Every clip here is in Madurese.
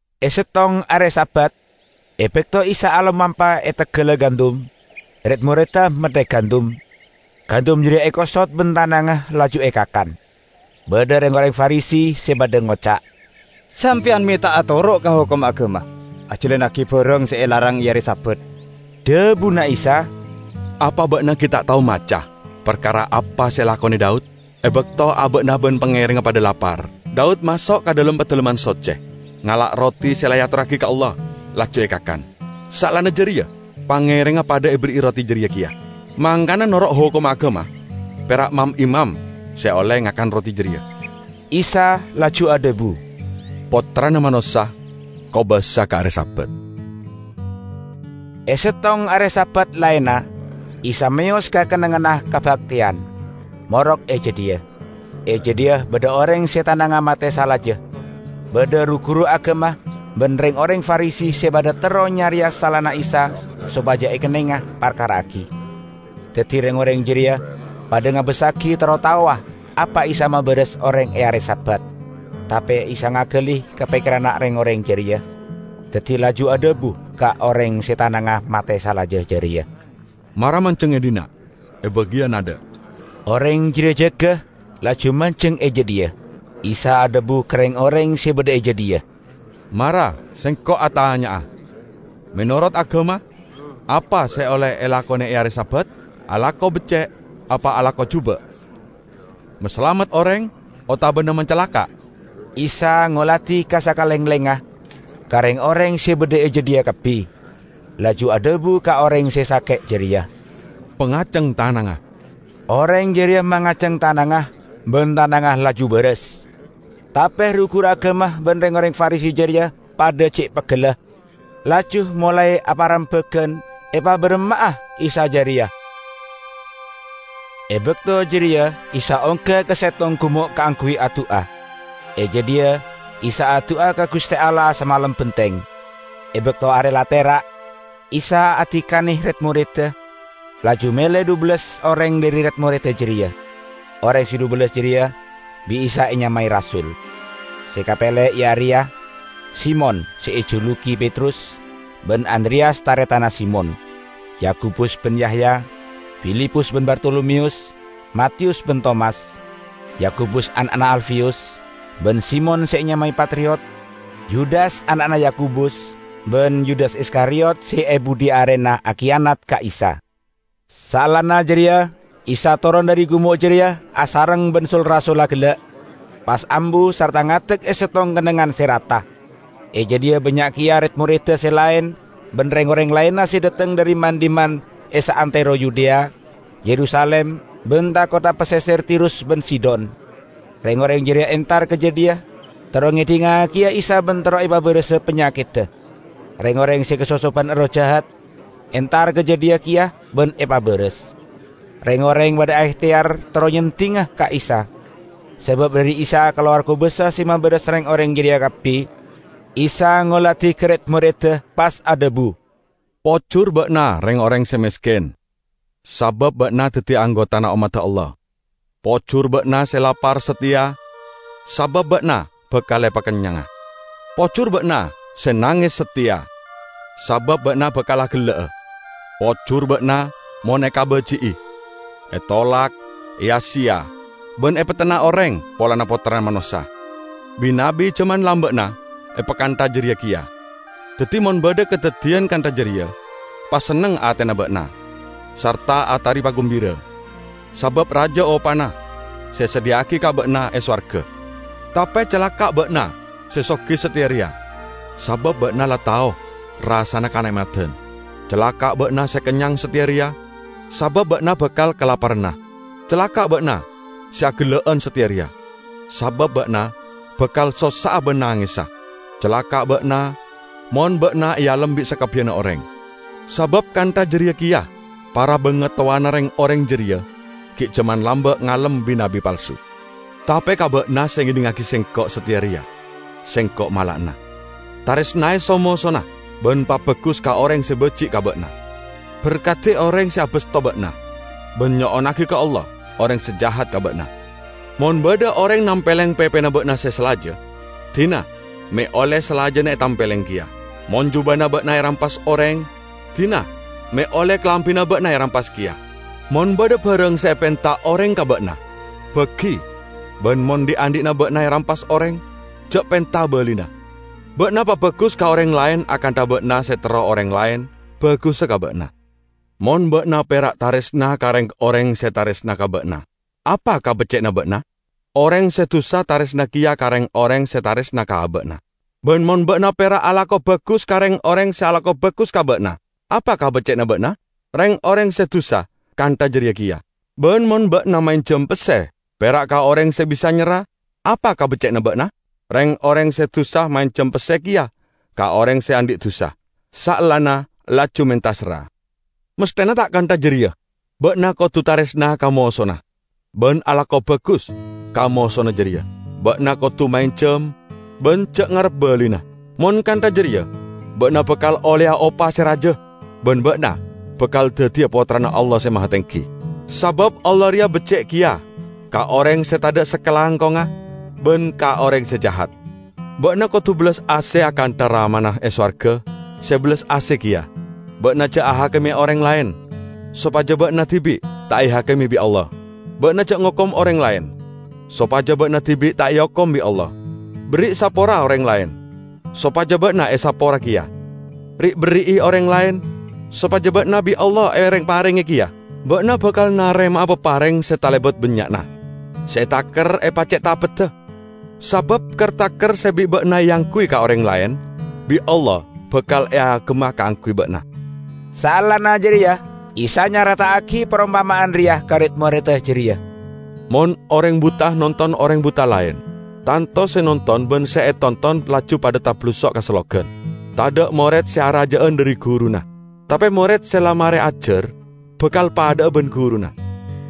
E settong are Sabat, e bakto Isa alomampa e teggalla gandum, red-moredda metthek gandum. Gandum jareya ekosot ban tanangnga laju ekakan. Badha reng-oreng Farisi se padha ngoca', "Sampeyan me' ta' atoro' ka hokomma agama, ajalannagi barang se elarang e are Sabat?" Dhabuna Isa, "Apa ba'na gi' ta' tao maca parkara apa se elakone Daud, e bakto aba'na ban pangerengnga padha lapar? Daud maso' ka dhalem Padalemman Socce, ngala' roti se la eatorragi ka Allah, laju ekakan. Saellana jareya pangerengnga padha eberri'i roti jareya keya. Mangkana, noro' hokomma agama, pera' mam-imam se olle ngakan roti jareya." Isa laju adhabu, "Pottrana Manossa kobasa ka are Sabat." E settong are Sabat laenna, Isa meyos ka kennengnganna kabakteyan, morok e jadhiya. E jadhiya badha oreng se tanangnga mate salaja. Badha ru-guru agama ban reng-oreng Farisi se padha terro nyareya salana Isa sopaja ekennenga parkara'agi. Daddi reng-oreng jareya padha ngabassagi terro taowa apa Isa mabarasa oreng e are Sabat. Tape Isa ngagali ka pekkeranna reng-oreng jareya. Daddi laju adhabu ka oreng se tanangnga mate salaja jareya, "Mara manjeng e dhinna', e bagiyan adha'!" Oreng jareya jaga, laju manjeng e jadhiya. Isa adhabu ka reng-oreng se badha e jadhiya, "Mara Sengko' atanya'a. Menorot agama, apa se olle elakone e are Sabat? Alako becce' apa alako juba'? Masalamet oreng otabana macalaka'?" Isa ngoladi ka sakalenglengnga, ka reng-oreng se badha e jadhiya kabbi, laju adhabu ka oreng se sake' jareya, "Pangaceng tanangnga." Oreng jareya mangaceng tanangnga, ban tanangnga laju baras. Tape ru-guru agama ban reng-oreng Farisi jareya padha ce' peggella, laju molae aparembagan epabaramma'a Isa jareya. E bakto jareya Isa ongga ka settong gumo' kaangguy adu'a. E jadhiya Isa adu'a ka Guste Allah samalem benteng. E bakto are la tera', Isa adikane red-moredda, laju mele dhubellas oreng dhari red-moredda jareya. Oreng se dhubellas jareya bi' Isa enyamae rasul. Se kapele iya areya: Simon (se ejulugi Petrus), ban Andreyas taretanna Simon; Yakobus ban Yahya, Filipus ban Bartolomeyus, Matiyus ban Tomas, Yakobus ana'na Alfeyus, ban Simon (se enyamae Patriot), Yudas ana'na Yakobus ban Yudas Iskariyot se e budhi arena akiyanat ka Isa. Saellana jareya Isa toron dhari gumo' jareya asareng ban sul-rasulla gella', pas ambu sarta ngadek e settong kennengngan se rata. E jadhiya bannya' keya red-moredda se laen ban reng-oreng laenna se dhateng dhari man-dhimman e saantero Yudea, Yerusalim, ban tha-kottha paseser Tirus ban Sidon. Reng-oreng jareya entar ka jadhiya terro ngedhingngagiya Isa ban terro epabarasa panyakedda. Reng-oreng se kasosoban erroh jahat entar ka jadhiya keya ban epabaras. Reng-oreng padha aehteyar terro nyeddinga ka Isa, sabab dhari Isa kalowar kobasa se mabaras reng-oreng jareya kabbi. Isa ngoladi ka red-moredda pas adhabu, "Pojur ba'na reng-oreng se mesken, sabab ba'na daddi anggotana ommadda Allah! Pojur ba'na se lapar sateya; sabab ba'na bakal epakennyanga! Pojur ba'na se nanges sateya; sabab ba'na bakal agella'a! Pojur ba'na mon ekabaji'i, etolak, eya-seya ban epetenna oreng polana Pottrana Manossa! Bi-nabbi jaman lamba'na epakantha jareya keya. Daddi mon badha kadaddiyan kantha jareya, pasenneng atena ba'na, sarta atari pagumbira, sabab raja opana se esadhiya'agi ka ba'na e sowarga. Tape calaka' ba'na se sogi sateya reya; sabab ba'na la tao rassana kane'madan! Calaka' ba'na se kennyang sateya reya; sabab ba'na bakal kalaparana! Calaka' ba'na se agella'an sateya reya; sabab ba'na bakal sossa'a ban nangesa! Calaka' ba'na mon ba'na ealem bi' sakabbiyanna oreng; sabab kantha jareya keya para bangatowana reng-oreng jareya gi' jaman lamba' ngalem bi-nabbi palsu." "Tape ka ba'na se ngedhingngagi Sengko' sateya reya, Sengko' mala'ana: taresnae so-mosona, ban pabagus ka oreng se baji' ka ba'na. Berkadi oreng se abasto ba'na, ban nyo'onnagi ka Allah oreng se jahat ka ba'na. Mon badha oreng nampeleng pepena ba'na se salaja, dina me' olle salajanna etampeleng keya. Mon jubana ba'na erampas oreng, dina me' olle kalambina ba'na erampas keya. Mon badha barang se epenta oreng ka ba'na, bagi; ban mon dhi'-andhi'na ba'na erampas oreng, ja' penta balina. Ba'na pabagus ka oreng laen akantha ba'na se terro oreng laen bagussa ka ba'na. Mon ba'na pera' taresna ka reng-oreng se taresna ka ba'na, apa kabecce'anna ba'na? Oreng se dusa taresna keya ka reng-oreng se taresna ka aba'na! Ban mon ba'na pera' alako bagus ka reng-oreng se alako bagus ka ba'na, apa kabecce'anna ba'na? Reng-oreng se dusa kantha jareya keya! Ban mon ba'na maenjam pesse pera' ka oreng se bisa nyerra, apa kabecce'anna ba'na? Reng-oreng se dusa maenjam pesse keya ka oreng se andhi' dusa, saellana laju menta serra. Masthena ta' kantha jareya! Ba'na kodu taresna ka mosona ban alako bagus ka mosona jareya. Ba'na kodu maenjam ban ja' ngarep balina. Mon kantha jareya ba'na bakal olleya opa se raja ban ba'na bakal daddiya pottrana Allah Se Mahatenggi. Sabab Allah reya becce' keya ka oreng se tadha' sakalangkongnga ban ka oreng se jahat. Ba'na kodu bellas ase akantha Ramana e sowarga se bellas ase keya!" "Ba'na ja' ahakime oreng laen, sopaja ba'na dibi' ta' ehakime bi' Allah. Ba'na ja' ngokom oreng laen, sopaja ba'na dibi' ta' eokom bi' Allah. Berri' sapora oreng laen, sopaja ba'na esapora keya. Ri'-berri'i oreng laen, sopaja ba'na bi' Allah ereng-parenge keya. Ba'na bakal narema'a papareng se talebat bannya'na, se etaker epace'tapedda. Sabab ker-taker se bi' ba'na eangguy ka oreng laen bi' Allah bakal eagemma kaangguy ba'na." Saellana jareya Isa nyareta'agi parompama'an reya ka red-moredda jareya, "Mon oreng buta nonton oreng buta laen, tanto se nonton ban se etonton laju padha tabalusok ka sellogan. Tadha' mored se araja'an dhari guruna. Tape mored se la mare ajar, bakal padha'a ban guruna.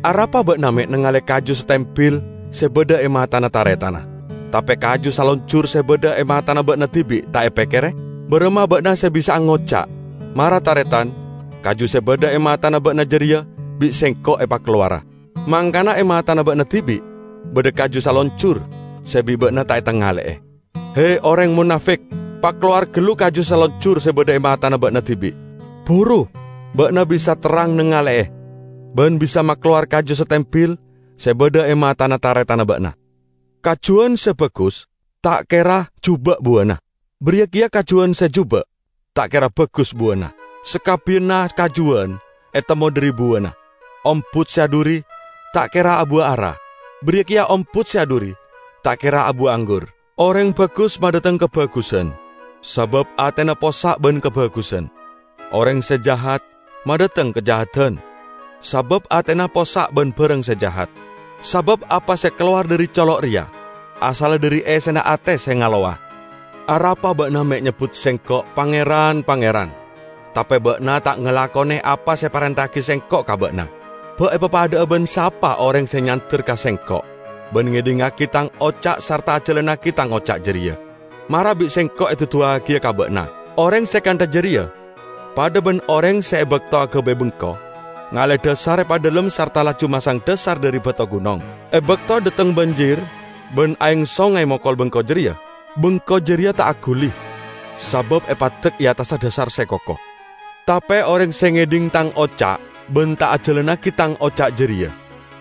Arapa ba'na me' nangale kaju satembil se badha e matana taretanna, tape kaju salonjur se badha e matana ba'na dibi' ta' epekkere? Baramma ba'na se bisa'a ngoca', 'Mara, taretan, kaju se badha e matana ba'na jareya bi' sengko' epakalowara,' mangkana e matana ba'na dibi' badha kaju salonjur se bi' ba'na ta' etangale'e? He, oreng monafik! Pakalowar gallu kaju salonjur se badha e matana ba'na dibi'. Buru ba'na bisa terrang nangale'e ban bisa makalowar kaju satembil se badha e matana taretanna ba'na." "Kajuwan se bagus ta' kera juba' buwana. Bariya keya kajuwan se juba' ta' kera bagus buwana. Sakabbiyanna kajuwan etemmo dhari buwana. Ombut se adhuri ta' kera abuwa ara, bariya keya ombut se adhuri ta' kera abuwa anggur. Oreng bagus madhateng kabagusan sabab atena possa' ban kabagusan. Oreng se jahat madhateng kajahadan sabab atena possa' ban barang se jahat. Sabab apa se kalowar dhari colo' reya asalla dhari essena ate se ngalowa." "Arapa ba'na me' nyebbut Sengko' 'Pangeran, Pangeran,' tape ba'na ta' ngalakone apa se eparenta'agi Sengko' ka ba'na? Ba' epapadha'a ban sapa oreng se nyander ka Sengko' ban ngedhingngagi Tang oca' sarta ajalannagi Tang oca' jareya? -- Mara bi' Sengko' eduduwagiya ka ba'na --. Oreng se kantha jareya padha ban oreng se e bakto agabay bengko ngale dhasar epadhalem sarta laju masang dhasar dhari bato gunong. E bakto dhateng banjir ban aeng songay mokol bengko jareya, bengko jareya ta' aguli, sabab epaddek e attassa dhasar se koko. Tape oreng se ngedhing Tang oca' ban ta' ajalannagi Tang oca' jareya,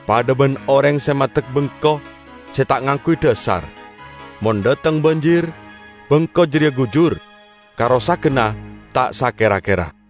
padha ban oreng se maddek bengko se ta' ngangguy dhasar. Mon dhateng banjir, bengko jareya gujur; karosaganna ta' sakera-kera!"